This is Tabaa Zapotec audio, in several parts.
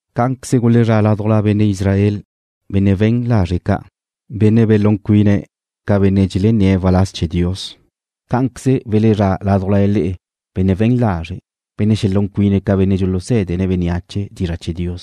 Cá'anqueze gulezrá' ládujla benne' Israel benne' we̱n lazre' ca', benne' belún cuine̱' ca benne' dxelenné̱' waláz chee̱ Dios. Cá'anqueze welezrá' ládujla le'e benne' we̱n lazre', benne' xelún cuine̱' ca benne' dxulusé̱dene̱' bénneache dizra' chee̱ Dios.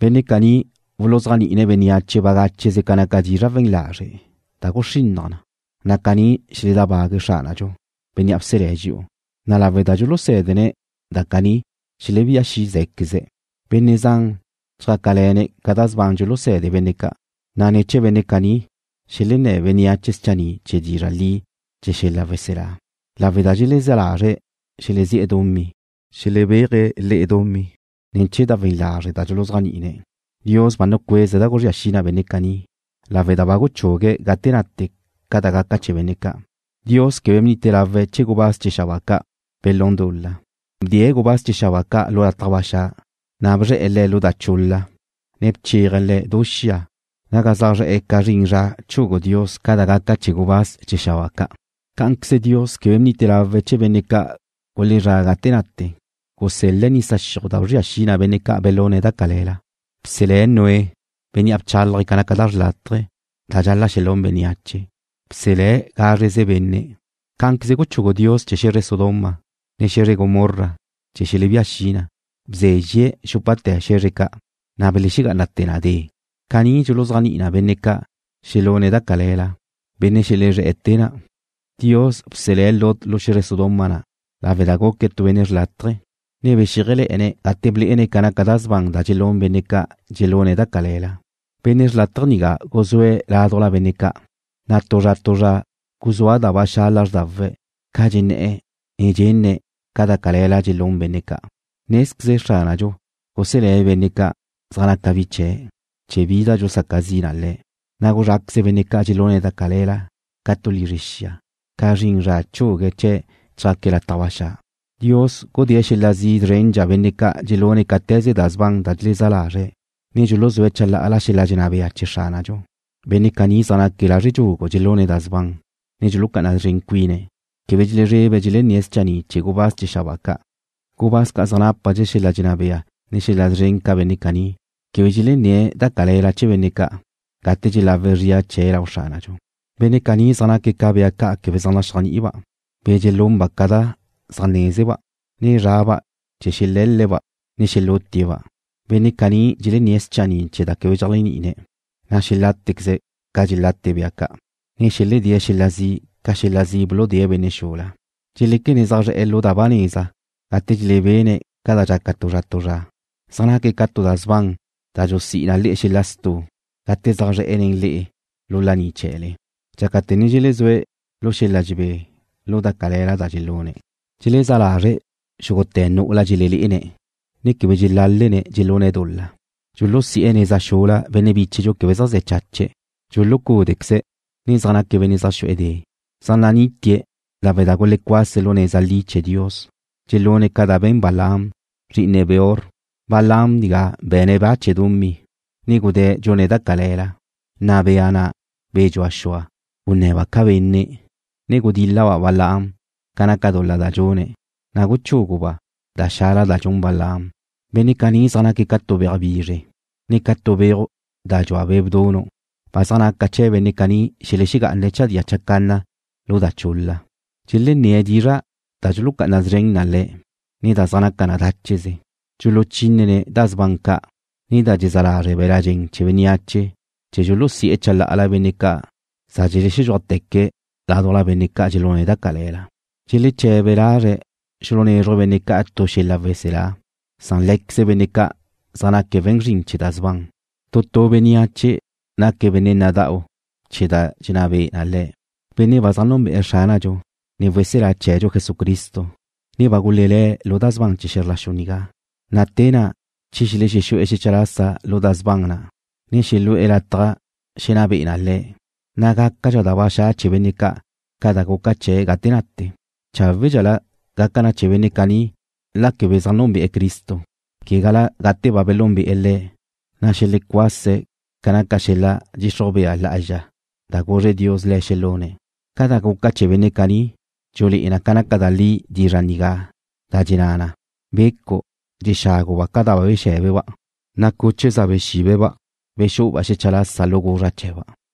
Benne' caní wuluzéajni'ine̱' bénneache bagácheze ca naca dizra' we̱n lazre' da guxrinnaj na, na' caní xeledábague̱' Xránadxu, Bénnea' bselé̱' dxi'u, na' lawe' da dxulusé̱dene̱' da caní xelebía xi' zé̱queze̱'. Benne' zan chjácale̱ne̱' ca da sban dxulusé̱de benne' ca', na' ne̱ chee̱ benne' caní xelenné̱ bénneache schanni' chee̱ dizra' li chee̱ xel-la' weselá. Lawe' da dxelezá lazre̱' xelezí'e̱ dumí, xelebéaje̱' le'e dumí ne̱ chee̱ da we̱n lazre' da dxuluzéajni'ine̱' le'e. Dios ba nucueze̱' da guzría xi na benne' caní, lawe' da ba guchugue̱' gate nate ca da gaca chee̱ benne' ca'. Dios quebe bnite lawe̱' chee̱ gubáz chee̱ xabáa ca' belún dul-la. Bdee̱' gubáz chee̱ xabáa ca' lu lataj ba xa', ne bzre̱'e̱ le̱' lu da chul-la, ne bcheaje̱' le̱' du xia naga zaj nadxéaje̱' ca zrin zra chugu Dios ca da gaca chee̱ gubáz chee̱ xabáa ca'. Cá'anqueze Dios quebe bnite lawe̱' chee̱ benne' ca' gulezrá' gate nate. Gusel-le̱' nisa xiuj da bzria xi na benne' ca' belune̱' da cale̱la. Bselé̱' Noé, bénnea' bchálaje̱' ca naca da xrlátaje da dxal-la' xelún bénneache. Bselé̱' gázreze benne'. Cá'anqueze guchugu Dios chee̱ xe̱zre Sodoma, ne xe̱zre Gomorra chee̱ xelebía xi na. Bzézxie̱' dxúpate̱ xe̱zre ca', na' belexegá'anate̱ na de. Caní dxuluzéajni'i na benne' ca' xelune̱' da cale̱la, benne' xelezré̱'e̱ te na'. Dios bselé̱' Lot lu xe̱zre Sodoma na' lawe' da guque̱' tu benne' xrlátaje, ne bexíajele̱'e̱ne̱' gate blé'ene̱' ca naca da sban da dxelún benne' ca' dxelune̱' da cale̱la. Benne' xrlátaje nigá guzúe̱' ládujla benne' ca', na' tu zra tu zra guzúa ba xa' lázrdawe̱' ca dxenné̱'e̱, ne dxenne̱' ca da cale̱la da dxelún benne' ca'. Nézqueze Xránadxu guselé̱' benne' zaj naca bi chee̱' che bi da dxusaca zi na le̱', na' guzráqueze̱' benne' ca' dxelune̱' da cale̱la, ca tu lizre xia, ca zrin zra chugue̱' chee̱' chjaque̱' lataj ba xa'. Dios xudée̱' xel-la' zi' zrendxa benne' ca' dxelune̱' cáte̱ze da sban da dxelezá lazre̱', ne dxuluzúe̱' chalá'ala xel-la' dxenná bea chee̱ Xránadxu. Benne' caní zaj naque̱' lazre' dxugu dxelune̱' da sban, ne dxulucá'ana szren cuine̱'. Quebe dxelezrebe̱' dxelenné̱' schanni' chee̱ gubáz chee̱ xabáa ca'. Gubáz ca' zaj nápadxe̱' xel-la' dxenná bea, ne xel-la' szren ca benne' caní, quebe dxelenné̱' da cale̱la chee̱ benne' ca' gate dxelawe̱' zria chee̱' lau Xránadxu. Benne' caní zaj naque̱' ca bea ca' quebe zaj naxéajni'iba', be̱ dxelunba' ca da zaj nézezeba', ne zraba' chee̱ xelé̱l-le̱'-ba', ne xelutie̱'-ba'. Benne' caní dxelenné̱' schanni' chee̱ da quebe dxeléajni'ine̱', na' xelátequeze̱' ca dxelate bea ca', ne xeledée̱' xel-la' zi' ca xel-la' zi' buludée̱' benne' xula. Dxeléquene̱' zaj zre̱'e̱ lu da ba neza gate dxelebene̱' ca da dxaca tu zra tu zra. Zaj naque̱' ca tu da sban da dxusí'i na le'e xel-la' stu' gate zaj zre̱'e̱ nen le'e lu laní chee̱le, dxácate̱ ne dxelezúe̱' lu xel-la' dxebé lu da cale̱la da dxelune̱'. Dxelezá lazre̱' xúgute̱ nu'ula dxelelé'ene̱', ne quebe dxelálene̱' dxelune̱' dul-la. Dxulusi'e̱ neza xula benne' bíchedxu quebe zaj ze̱ chache̱'. Dxulucúdequeze̱', ne zaj naque̱' benne' zaj xu'e̱ de'. Zaj nanítie̱' lawe' da gulecuase̱' lu neza li chee̱ Dios. Dxelune̱' ca da be̱n Balaam, zri'ine Beor. Balaam nigá be̱ne̱' ba chee̱ dumí, ne gudé̱' dxune̱' da cale̱la, na' bea na', be̱ dxua xua', gunne̱ba' ca benne', ne gudíl-laba' Balaam ca naca dul-la da dxune̱', na' guchúguba' da xala da dxun Balaam. Benne' caní zaj naque̱' ca tu beaj bizre, ne ca tu beuj da dxua be' bdunu'. Ba zaj naca chee̱ benne' ca' xelexegá'ane̱' chadía chacanna lu da chul-la. Dxelenné̱' dizra' da dxulucá'ana szren na le̱', ne da zaj naca na dácheze. Dxuluchínene̱' da sban ca', ne da dxezá lazre' be̱la' dxen chee̱ bénneache chee̱ dxulusi'e̱ chalá'ala benne' ca' za dxelexedxúajteque̱' ládujla benne' ca' dxelune̱' da cale̱la. Dxeleche̱be lazre̱' xulunézruje̱' benne' ca' tu xel-la' weselá, san lé̱queze benne' ca' zaj naque̱' we̱n zrin chee̱ da sban. Tu tu bénneache naque̱' benne' nada'u chee̱ da dxenná be'e na le̱'. Benne' ba zaj núnbe'e̱ Xránadxu, ne Weselá chee̱dxu Jesucristo, ne ba gulelé̱' lu da sban chee̱ xe̱zr la xu nigá, na' te na' che xelexexu'e̱ xecha lasa lu da sban na', ne xelu'e̱ lataj xenná be'e na le̱', na' gácadxa da ba xa' chee̱ benne' ca' ca da guca chee̱' gate nate. Cháwe'dxela gaca na chee̱ benne' caní la quebe zaj núnbe'e̱ Cristo, quegala gate ba belúnbe'e̱ Le̱', na' xelexecuase̱' ca naca xel-la' dxixruj bea lá'azxa da guzre Dios le̱' xelune̱'. Ca da guca chee̱ benne' caní dxulé'e na naca da li dizra' nigá da dxenná na: Becu' dxexáguba' ca da ba bexé̱beba', na' cuche za bexíbeba' bexú'uba' xecha lasa lu guzra' chee̱ba'.